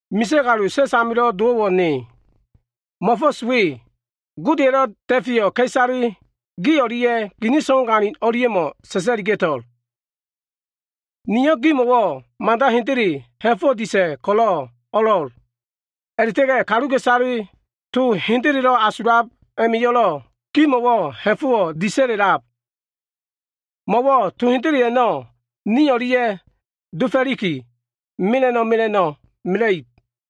Misa꞉ kalu sa꞉s amilo꞉ dowo꞉wo꞉ ne ko꞉lo꞉, mo꞉fo꞉s we Godeya꞉lo꞉ da꞉feyo꞉ ka꞉isale gi o꞉lia꞉ gini so꞉wagalin o꞉lia꞉mo꞉ sa꞉sa꞉liga꞉to꞉l. Niyo꞉ gimo꞉wo꞉ mada hendele ha꞉fo꞉wo꞉ disa꞉ ko꞉lo꞉ o꞉lo꞉l. A꞉la꞉ta꞉ga꞉ kaluka꞉isale to hendelelo꞉ asulab a꞉ma꞉yo꞉lo꞉ gimo꞉wo꞉ ha꞉fo꞉wo꞉ disa꞉la꞉lab. Mo꞉wo꞉ to hendele a꞉no꞉ nio꞉ o꞉lia꞉ dofo꞉liki, mela꞉no꞉ mela꞉no꞉ mela꞉ib.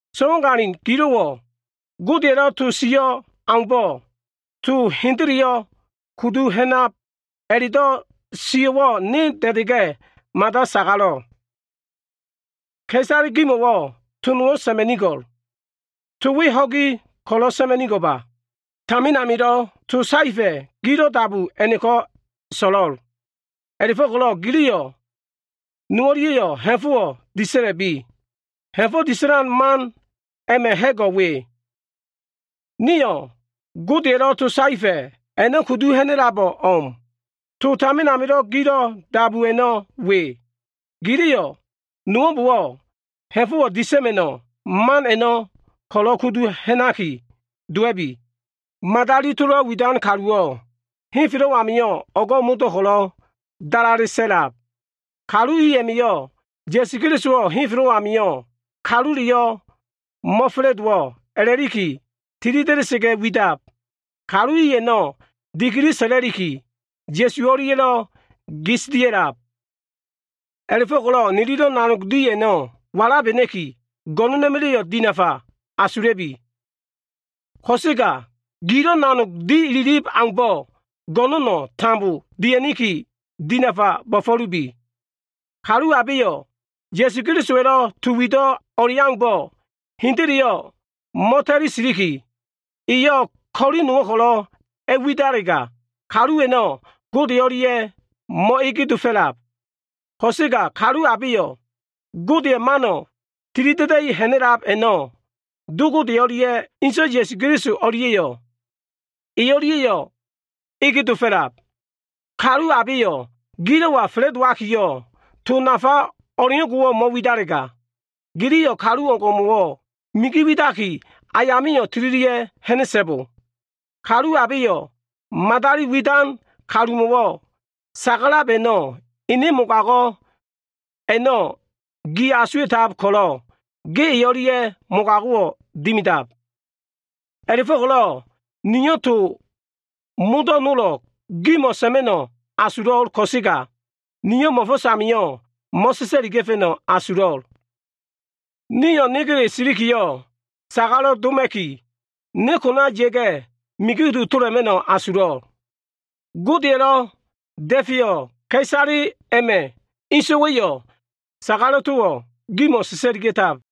So꞉wagalin gilo꞉wo꞉ Godeya꞉lo꞉ to sio꞉ aumbo꞉, to hendeleyo꞉ kudu ha꞉nab a꞉la꞉do꞉ sio꞉wo꞉ ne da꞉da꞉ga꞉ mada sagalo꞉. Ka꞉isale gimo꞉wo꞉ to nowo꞉ sa꞉ma꞉nigo꞉l. To we ho꞉gi ko꞉lo꞉ sa꞉ma꞉nigo꞉ba. Tamin amilo꞉ to saefa꞉ gilo꞉ dabu a꞉no꞉ ko꞉lo꞉ so꞉lo꞉l. A꞉la꞉fo꞉ko꞉lo꞉ giliyo꞉ nowo꞉lia꞉yo꞉ ha꞉fo꞉wo꞉ disa꞉la꞉bi. Ha꞉fo꞉ disa꞉lan man a꞉ma꞉ ha꞉go꞉ we. Nio꞉ Godeya꞉lo꞉ to saefa꞉ a꞉no꞉ kudu ha꞉na꞉labo꞉ o꞉m. To tamin amilo꞉ gilo꞉ dabu a꞉no꞉ we. Giliyo꞉ nowo꞉mbo꞉wo꞉ ha꞉fo꞉ disa꞉ma꞉no꞉ man a꞉no꞉ ko꞉lo꞉ kudu ha꞉naki dowa꞉bi. Madali tolo꞉ widan kaluwo꞉ henfelo꞉ amio꞉ o꞉go꞉ modo꞉ ko꞉lo꞉ dalale sa꞉lab. Kalu i a꞉ma꞉yo꞉ Ya꞉su Kelisowo꞉ henfelo꞉ amio꞉ kaluleyo꞉ mo꞉fa꞉la꞉dowo꞉ a꞉la꞉liki tilida꞉da꞉sa꞉ga widab. Kalu i a꞉no꞉ dikili sa꞉la꞉liki, Ya꞉su o꞉lia꞉ gis dia꞉lab. A꞉la꞉fo꞉ko꞉lo꞉ nililo꞉ nanog di a꞉no꞉ walabena꞉ki, go꞉no꞉na꞉ma꞉la꞉yo꞉ dinafa asula꞉bi! Ko꞉sega gilo꞉ nanog di ililib aumbo꞉ go꞉no꞉no꞉ tambo dia꞉niki, dinafa bo꞉fo꞉lubi. Kalu abeyo꞉ Ya꞉su Kelisowa꞉lo꞉ to wido꞉ o꞉leaumbo꞉ hendeleyo꞉ mo꞉ta꞉li siliki, eyo꞉ ko꞉li nowo꞉ ko꞉lo꞉ a꞉widalega, kalu a꞉no꞉ Gode o꞉lia꞉yo꞉ mo꞉ege dofo꞉lab. Ko꞉sega kalu abeyo꞉ Godeya꞉ mano꞉ tilida꞉da꞉i ha꞉na꞉lab a꞉no꞉ Do Gode o꞉lia꞉ Inso꞉ Ya꞉su o꞉lia꞉yo꞉ e o꞉lia꞉ ege dofo꞉lab. Kalu abeyo꞉ gilo꞉wa fa꞉la꞉dowakiyo꞉, to nafa o꞉leo꞉ngo꞉wo꞉ mo꞉widalega, giliyo꞉ kalu o꞉ngo꞉wo꞉ migi widaki, ayamio꞉ tililia꞉ ha꞉na꞉so꞉bo. Kalu abeyo꞉ madali widan kalumo꞉ sagalab a꞉no꞉ ene man mogago꞉ a꞉no꞉ gi asuwa꞉tab ko꞉lo꞉, ge e o꞉lia꞉ mogago꞉wo꞉ dimidab. A꞉la꞉fo꞉ko꞉lo꞉ niyo꞉ to modo꞉ nolo꞉ gimo꞉ sa꞉ma꞉no꞉ asulo꞉l ko꞉sega, niyo꞉ mo꞉fo꞉s amio꞉ mo꞉sa꞉sa꞉liga꞉fa꞉no꞉ asulo꞉l. Nio꞉ negele silikiyo꞉ sagalo꞉ doma꞉niki, ne kona ya꞉ga꞉ migi kudu tola꞉ma꞉no꞉ asulo꞉l. Godeya꞉lo꞉ da꞉feyo꞉ ka꞉isale a꞉ma꞉ inso꞉wa꞉yo꞉ sagalo꞉ towo꞉ gimo꞉ sa꞉sa꞉liga꞉tab.